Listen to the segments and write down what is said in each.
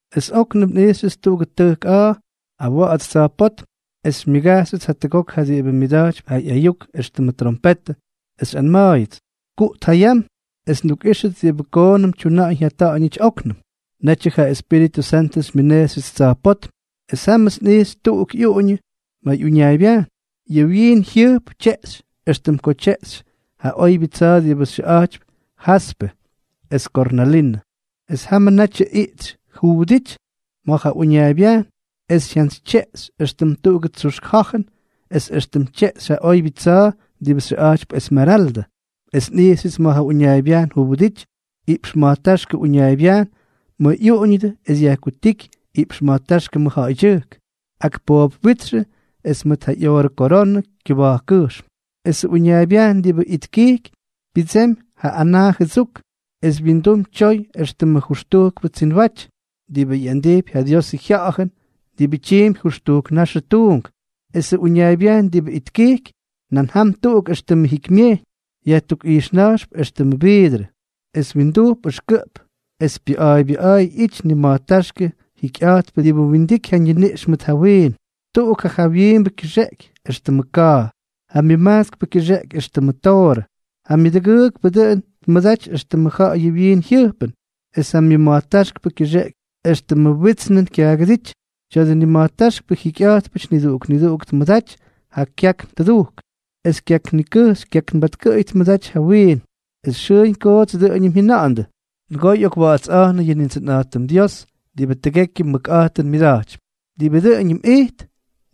Es óknʉm nꞌijxyʉts tuꞌugʉ tʉjk a̱a̱ awa̱ꞌa̱ts tsa̱jpótm. Es xymyʉgajxyʉts jatʉgok ja diꞌibʉ myʉda̱jtypy ja ꞌyayuk éxtʉmʉ trompetʉ, es xyꞌanma̱a̱yʉts: —Kuꞌt ja yam, es ndukꞌíxʉt diꞌibʉ koonʉm tyuna̱ꞌa̱ñ jyata̱ꞌa̱ñʉty óknʉm. Netyʉ ja Espíritʉ Santʉ xymyʉnejxyʉts tsa̱jpótm. Es jámʉts nꞌijxy tuꞌuk ꞌyuꞌuñʉ ma̱ ꞌyuñaaybyajn. Yʉ wyiin jyʉjp tyeꞌxy éxtʉm ko tyeꞌxy ja oybyʉ tsa̱a̱ diꞌibʉ xyʉꞌa̱jtypy jaspe es kornalinʉ. Es jamʉ natyʉ iꞌtsy juwʉdity ma̱ ja ꞌyuñaaybyajn, es jyantsytyeꞌxy, éxtʉm tuꞌugʉ tsuxk ja̱jʉn es éxtʉm tyeꞌxy ja oybyʉ tsa̱a̱ diꞌibʉ xyʉꞌa̱jtypy esmeraldʉ. Es nꞌijxyʉts ma̱ ja uñaaybyajn juwʉdity iꞌpx ma̱jtáxkʉ uñaaybyajn ma̱ ꞌyuꞌuñʉdʉ es yajkutíky iꞌpx ma̱jtáxkʉ mʉjja̱ꞌa̱ydyʉjk, ak poobwítxʉ es mʉt ja ꞌyoorʉ koronʉ kyʉba̱jkkʉjxm. Esʉ uñaaybyajn diꞌibʉ itkijky pyʉdsemy ja anaa jʉdsuk. Es wyindum tyoy éxtʉm jʉxtujkʉ tsinwaty, diꞌibʉ ꞌyandijpy ja Diosʉ Jya̱ꞌa̱jʉn diꞌibʉ tyiimpy jʉxtujk naxʉ tuunk. Esʉ uñaaybyajn diꞌibʉ itkijky, nan jam tuꞌuk éxtʉmʉ jikymyejyñ, yajtukꞌijxna̱jxp éxtʉmʉ viidrʉ. Es windujp ʉxkʉꞌp es pyʉꞌa̱a̱ybyʉꞌa̱a̱y ꞌyity nima̱jtáxkʉ jikyꞌa̱jtpʉ diꞌibʉ windiky ja ñiniꞌx mʉt ja wiin. Tuꞌuk ja jawyiimbʉ kyʉxeꞌeky éxtʉmʉ ka̱a̱, ja myʉmajtskpʉ kyʉxeꞌeky éxtʉmʉ toorʉ, ja myʉdʉgʉʉkpʉ dʉꞌʉn tmʉdaty éxtʉmʉ ja̱ꞌa̱yʉ wyiin jyʉjpʉn, es ja myʉma̱jtáxkpʉ kyʉxeꞌeky éxtʉmʉ witsnʉn kyaagʉdíty. Tya̱dʉ nima̱jtáxkpʉ jikyꞌa̱jtpʉty niduꞌuk niduꞌuk tmʉdaty ja kyakn tʉdujk. Esʉ kyakn nikʉjxy kyaknbatkʉꞌʉy tmʉdaty ja wiin. Es xʉʉñ koots dʉꞌʉñʉm jyʉna̱ꞌa̱ndʉ: Nʉgoo ꞌyokwa̱ꞌa̱tsꞌa̱jnʉ yʉ Nindsʉnꞌa̱jtʉm Dios, diꞌibʉ tʉgekyʉ mʉkꞌa̱jtʉn myʉda̱jtypy, diꞌibʉ dʉꞌʉñʉm ijt,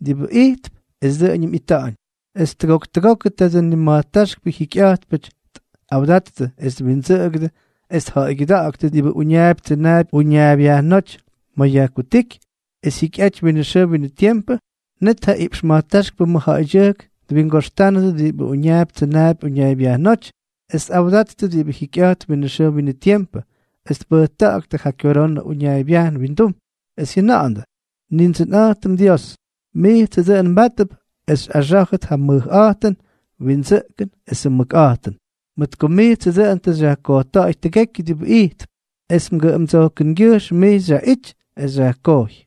diꞌibʉ ijtp es dʉꞌʉñʉm ꞌyita̱ꞌa̱ñ. Es tʉgok tʉgokʉ tadʉ nima̱jtáxkpʉ jikyꞌa̱jtpʉty tꞌawdattʉ es twindsʉꞌʉgʉdʉ es tja̱ꞌa̱ygyʉda̱ꞌa̱ktʉ diꞌibʉ uñaapy tsʉnaapy uñaaybyajnóty ma̱ yajkutíky, es jyikyꞌaty winʉ xʉʉ winʉ tiempʉ, net ja iꞌpx ma̱jtáxkpʉ mʉjja̱ꞌa̱ydyʉjk twingoxtánʉdʉ diꞌibʉ uñaapy tsʉnaapy uñaaybyajnóty, es tꞌawdattʉ diꞌibʉ jikyꞌa̱jtp winʉ xʉʉ winʉ tiempʉ, es tpʉjta̱ꞌa̱ktʉ ja kyoronʉ uñaaybyajn windum, es jyʉna̱ꞌa̱ndʉ: Nindsʉnꞌa̱jtʉm Dios, mijtsʉ dʉꞌʉn mbátʉp es xyꞌaxá̱jʉt ja mʉjꞌa̱jtʉn, windsʉꞌkʉn esʉ mʉkꞌa̱jtʉn, mʉt ko mijtsʉ dʉꞌʉn tʉ xyajkojta̱ꞌa̱y tʉgekyʉ diꞌibʉ ijtp, es mgʉꞌʉmdsojkʉngyʉjxm mij xyaꞌity es xyajkojy.